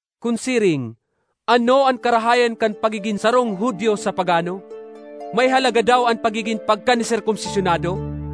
Kun siring, ano an karahayan kan pagigin sarong Judio sa pagano? May halaga daw an pagigin (pagka)parkaniserkomsisyonado?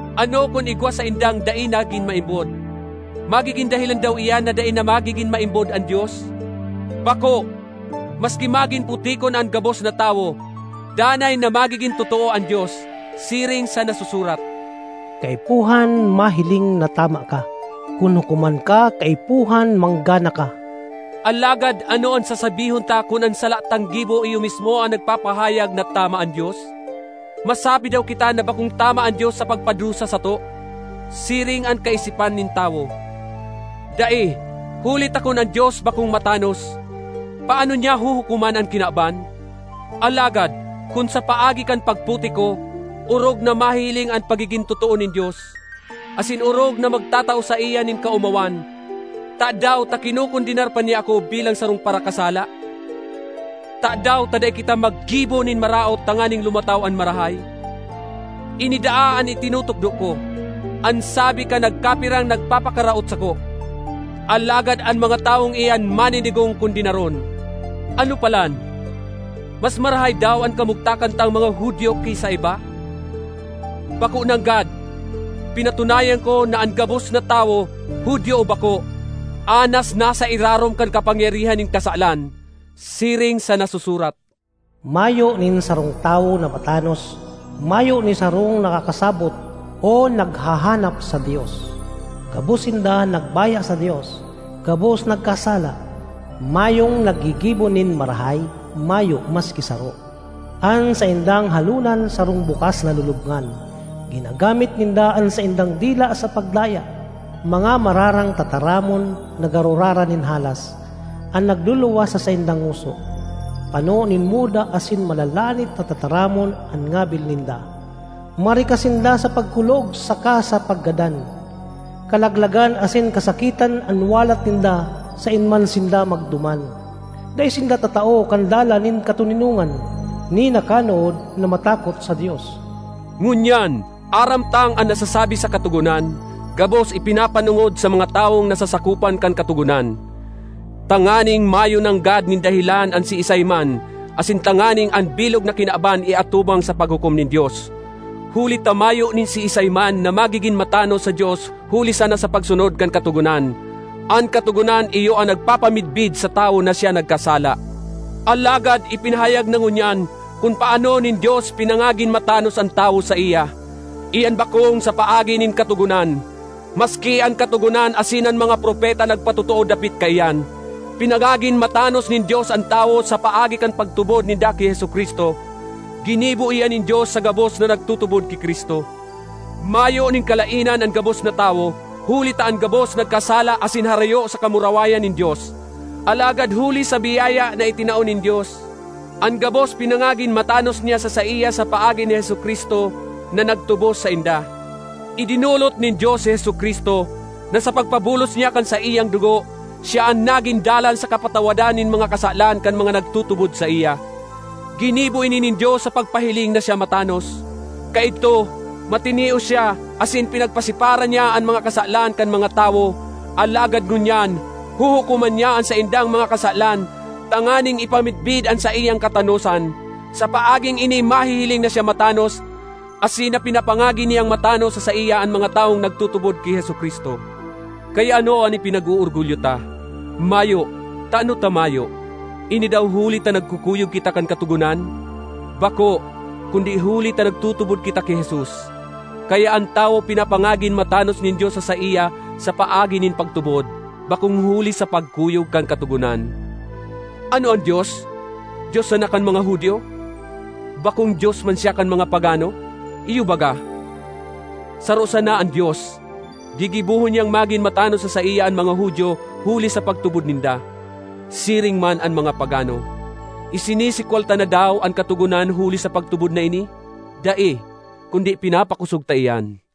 Ano kun igwa sa saindang dai nagin maimbod? Magigin dahelan daw iyan na dai na magigin maimbod an Dios? Bako! Maski magin putikon an gabos na tawo, danay na magigin totoo an Dios, siring sa nasusurat, “Kaipuhan mahiling na tama ka; kun hukoman ka kaipuhan manggana ka.” Alagad ano an sasabihon ta kun an sala tang gibo iyo mismo an nagpapahayag na tama an Dios? Masabi daw kita na bakong tama an Dios sa pagpadusa sato? (Siring an kaisipan nin tawo.) Dai! Huli ta kun an Dios bakong matanos, paano niya huhukoman an kinaban? Alagad kun sa paagi kan pagputik ko, orog na mahihiling an pagigin totoo nin Dios, asin orog na magtatao saiya nin kaomawan, tadaw ta kinokondenar pa niya ako bilang sarong parakasala? Tadaw ta dai kita maggibo nin maraot tanganing lumataw an marahay? Ini daa an itinutukdo ko, an sabi kan nagkapirang nagpapakaraot sako! Alagad an mga tawong iyan maninigong kondenaron. Ano palan? Mas marahay daw an kamugtakan tang mga Judio ki sa iba? Bako nanggad! Pinatunayan ko, na an gabos na tawo, Judio o bako, anas nasa irarom kan kapangyarihan nin kasalan. Siring sa nasusurat, “Mayo nin sarong tawo na matanos, mayo ni sarong nakakasabot, o naghahanap sa Dios. Gabos sinda nagbaya sa Dios, gabos nagkasala. Mayong naggigibo nin marahay, mayo maski saro. An saindang halonan sarong bukas na lulubngan, ginagamit ninda an saindang dila sa pagdaya. Mga mararang tataramon, na garo rara nin halas, an nagluluwas sa saindang ngoso; pano nin muda asin malalanit na tataramon an ngabil ninda. Marikas sinda sa pagkulog saka sa paggadan. kalaglagan asin kasakitan an walat ninda saen man sinda magduman. Dai sinda tatao kan dalan nin katoninongan, ni nakanood na matakot sa Dios.” Ngunyan aram tang an nasasabi sa Katogonan gabos ipinapanongod sa mga tawong nasasakopan kan Katogonan, tanganing mayo nanggad nin dahelan an siisay man, asin tanganing an bilog na kinaban iatubang sa paghukom nin Dios. Huli ta mayo nin siisay man na magigin matanos sa Dios huli sana sa pagsunod kan Katogonan; an Katogonan iyo an nagpapamidbid sa tawo na siya nagkasala. Alagad ipinahayag na ngunyan kun paano nin Dios pinangagin matanos an tawo saiya. Iyan bakong sa paagi nin Katogonan, maski an Katogonan asin an mga propeta nagpatotoo dapit kaiyan. Pinangagin matanos nin Dios an tawo sa paagi kan pagtubod ninda ki Jesu-Cristo. Ginibo iyan nin Dios sa gabos na nagtutubod ki Cristo. Mayo nin kalaenan an gabos na tawo, huli ta an gabos nagkasala asin harayo sa kamurawayan nin Dios. Alagad huli sa biyaya na itinao nin Dios, an gabos pinangagin matanos niya sa saiya sa paagi ni Jesu-Cristo na nagtubos sainda. Idinolot nin Dios si Jesu-Cristo, na sa pagpabulos niya kan saiyang dugo, siya an nagin dalan sa kapatawadan nin mga kasalan kan mga nagtutubod saiya. Ginibo ini nin Dios sa pagpahiling na siya matanos. Kaidto, matinios siya asin pinagpasipara niya an mga kasalan kan mga tawo. Alagad ngunyan, huhukoman niya an saindang mga kasalan tanganing ipamidbid an saiyang katanosan. Sa paaging ini mahihiling na siya matanos asin na pinapangagin niyang matanos sa saiya an mga tawong nagtutubod ki Jesu-Cristo. Kaya ano an ipinag-oorgulyo ta? Mayo! Tano ta mayo? Ini daw huli ta nagkukuyog kita kan Katogonan? Bako, kundi huli ta nagtutubod kita ki Jesus. Kaya an tawo pinapangagin matanos nin Dios sa saiya sa paagi nin pagtubod, bakong huli sa pagkuyog kan Katogonan. Ano an Dios, Dios sana kan mga Judio? Bakong Dios man siya kan mga pagano? Iyo baga. Saro sana an Dios; gigibohon niyang magin matanos sa saiya an mga Judio huli sa pagtubod ninda, siring man an mga pagano. Isinisikwal ta na daw an Katogonan huli sa pagtubod na ini? Dai; kundi pinapakosog ta iyan.